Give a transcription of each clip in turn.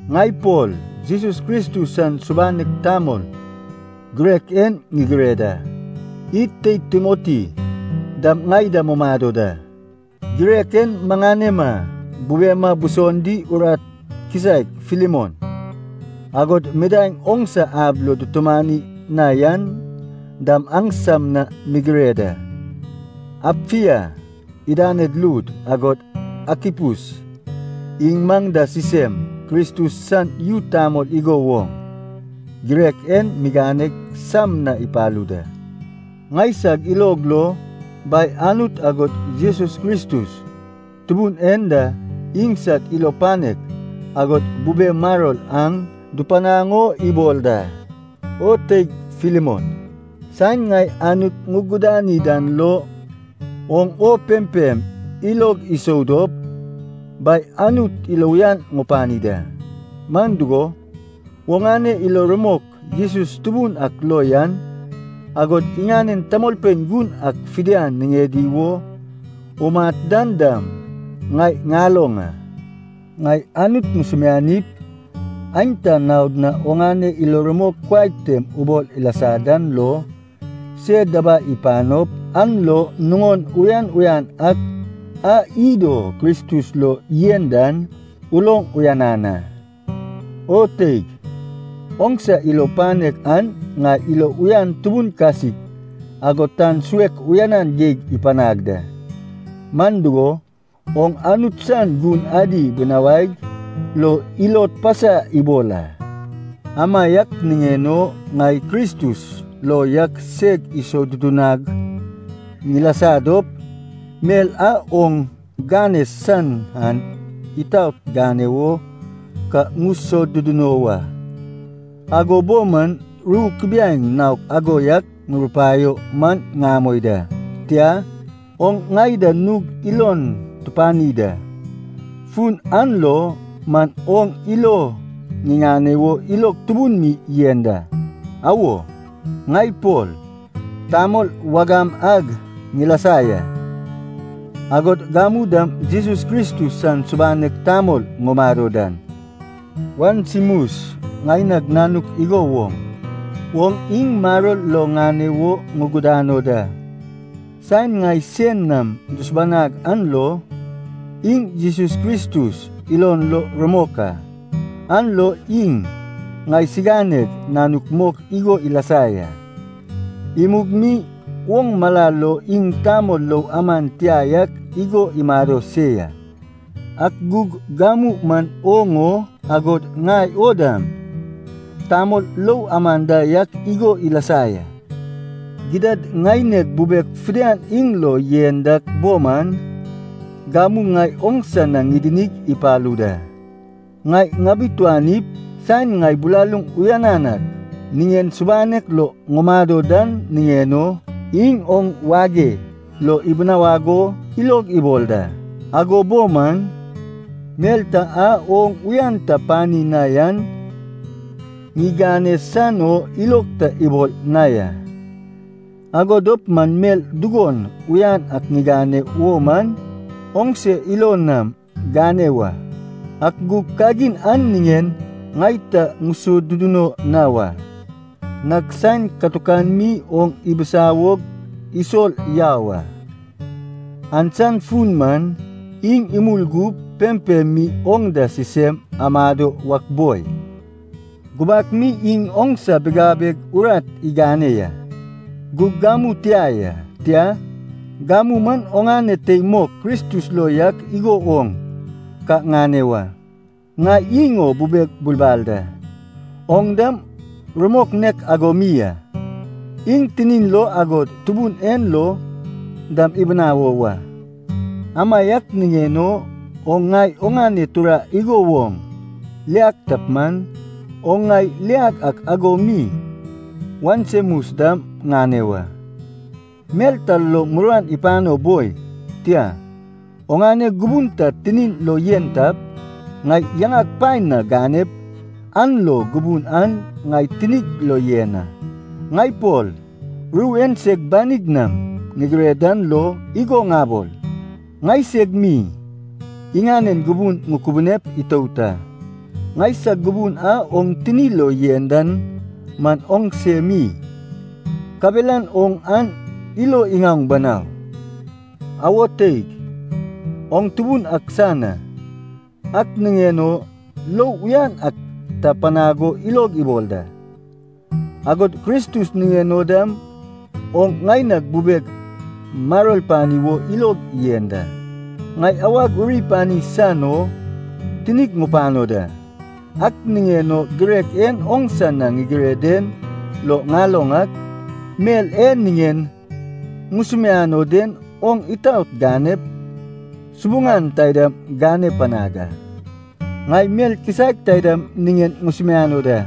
Ŋai Pol Jesus Kristus san subanek tamol girek en ŋigire da. Id teid Timoti dam ŋai da mumado da. Girek en maŋanema bubema buson di urat kisaek Filemon, agod midaeŋ oŋsa ab lo dutumani na yan dam aŋsam na ŋigire da. Apfia idaned lud, agod Akipus iŋ maŋ da sisem Kristus san yu tamol igo woŋ, girek en miganeg sam na ipalu da. Ŋaisag ilog lo Bai Anut agod Jesus Kristus Tubun en da iŋsad ilo panek agod bube maror aŋ dupanaŋ o ibol da. O teig Filemon, saen ŋai Anut ŋugudani dan lo, oŋ o pempem ilog isou dop, Bai Anut ilo uyan ŋupani da. Man dugo, oŋane ilo rumok Jesus Tubun ak lo yan, agod iŋanen tamolpein gun ak fidian niŋedi wo umat dan dam, ŋai ŋaloŋ a. Ŋai Anut ŋusumianip, aenta naod na oŋane ilo rumok kuai tem ubol ilasa dan lo se dabai ipanop, an lo nuŋon uyan uyan ak a id o Kristus lo yen dan uloŋ uyanan a. O teig, oŋsa ilo panek an ŋai ilo uyan tubun kasik, agod tan suek uyanan geig ipanag da. Man dugo, oŋ Anut san gun adi binawaig lo ilod pasa ibol a. Amaiak niŋen o ŋai Kristus lo yak seg isodudunag ŋilasa dop, mel a oŋ gane san an itaot gane wo ka ŋusoduduno wa. Ago bo man ru kubiaeŋ naok ago yak ŋurupaio man ŋamoi da. Tia, oŋ ŋai da nug ilon tupani da, fun an lo man oŋ ilo ŋiŋane wo ilog tubun mi yen da. Awo, ŋai Pol, tamol wagam ag ŋilasa ya, agod gamu dam Jesus Kristus san subanek tamol ŋumado dan, Onesimus, ŋaineg nanuk igo woŋ, oŋ iŋ maror lo ŋane wo ŋugudano da. Saen ŋai sein nam dusubanag an lo, iŋ Jesus Kristus ilon lo rumok a, an lo iŋ ŋaisiganeg nanuk mok igo ilasa ya. Imug mi oŋ mala lo iŋ tamol lou aman tia yak igo imado se ya, ak gug gamu man oŋ o, agod ŋai o dam, tamol lou aman da yak igo ilasa ya. Gidad ŋaineg bubeg fidian iŋ lo yen dak bo man, gamu ŋai oŋsa na ŋidinig ipalu da. Ŋai ŋabituanip, saen ŋai bilaluŋ uyanan ak niŋen subanek lo ŋumado dan niŋen o, iŋ oŋ wage lo ibinawag o ilog ibol da. Ago bo man, mel ta a oŋ uyan ta pani na yan ŋigane san o ilog ta ibol na ya. Ago dop man mel dugon uyan ak gane wo man, oŋse ilo nam gane wa. Ak gug kagin an niŋen ŋai ta ŋusoduduno na wa. Nag saen katukan mi oŋ ibisawog isol yau a, an san fun man, iŋ imul gup pempem mi oŋ da sisem amado wak boi. Gubak mi iŋ oŋsa bigabeg urat igane ya. Gug gamu tia ya, tia, gamu man oŋane tei mok Kristus lo yak igo oŋ ka ŋane wa. Ŋai iŋ o bubeg bulbal da, oŋ dam rumok nek ago mi a, iŋ tinin lo agod Tubun en lo dam ibinawo wa. Amaiak niŋen o, oŋ ŋai oŋane tura igo woŋ liag tap man, oŋ ŋai ŋiliag ak ago mi Onesimus dam ŋane wa. Mel ta lo muruan ipano boi, tia, oŋane gubun ta tinin lo yen tap, ŋai yaŋag paen na ganep, an lo gubun an ŋai tinig lo yen a. Ŋai Pol ru en seg banig nam ŋigire dan lo igo ŋabol, ŋaiseg mi iŋanen gubun ŋukubunep itout a. Ŋaisag gubun a oŋ tini lo yen dan man oŋse mi, kabelan oŋ an ilo iŋaoŋ banau. Awo teig, oŋ Tubun ak san a, ak niŋen o lou uyan ak ta panag o ilog ibol da. Agod Kristus niŋen o dam oŋ ŋaineg bubeg maror pani wo ilog yen da. Ŋai awag uri pani san o tinig ŋupano da. Ak niŋen o girek en oŋsa na ŋigire den lo ŋaloŋ ak, mel e niŋen ŋusumiano den oŋ itaot ganep subuŋan taidam gane panag a. Ŋai mel kisaek taidam niŋen ŋusumiano da.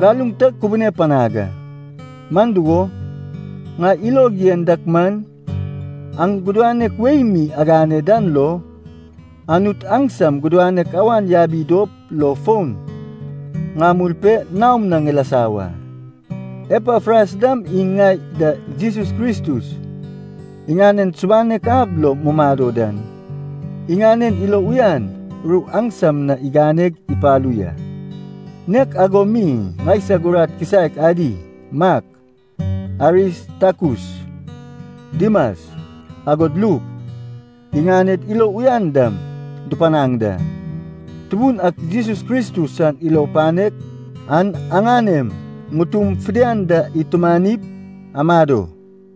Galuŋ ta kubune panag a. Man dugo, ŋai ilog yen dak man, aŋ gudanek wei mi agane dan lo, Anut aŋsam gudanek awan yabi dop lo fon ŋamul pe naom na ŋilasa wa. Epafras dam iŋ ŋai da Jesus Kristus niŋen subanek ab lo mumado dan, iŋanen ilo uyan ru aŋsam na iganeg ipalu ya. Nek ago mi ŋaisag urat kisaek adi, Mak, Aristakus, Dimas, agod Luk, iŋaned ilo uyan dam dupanaŋ da. Tubun ak Jesus Kristus san ilo panek an aŋanem ŋutum fidian da itumanip amado.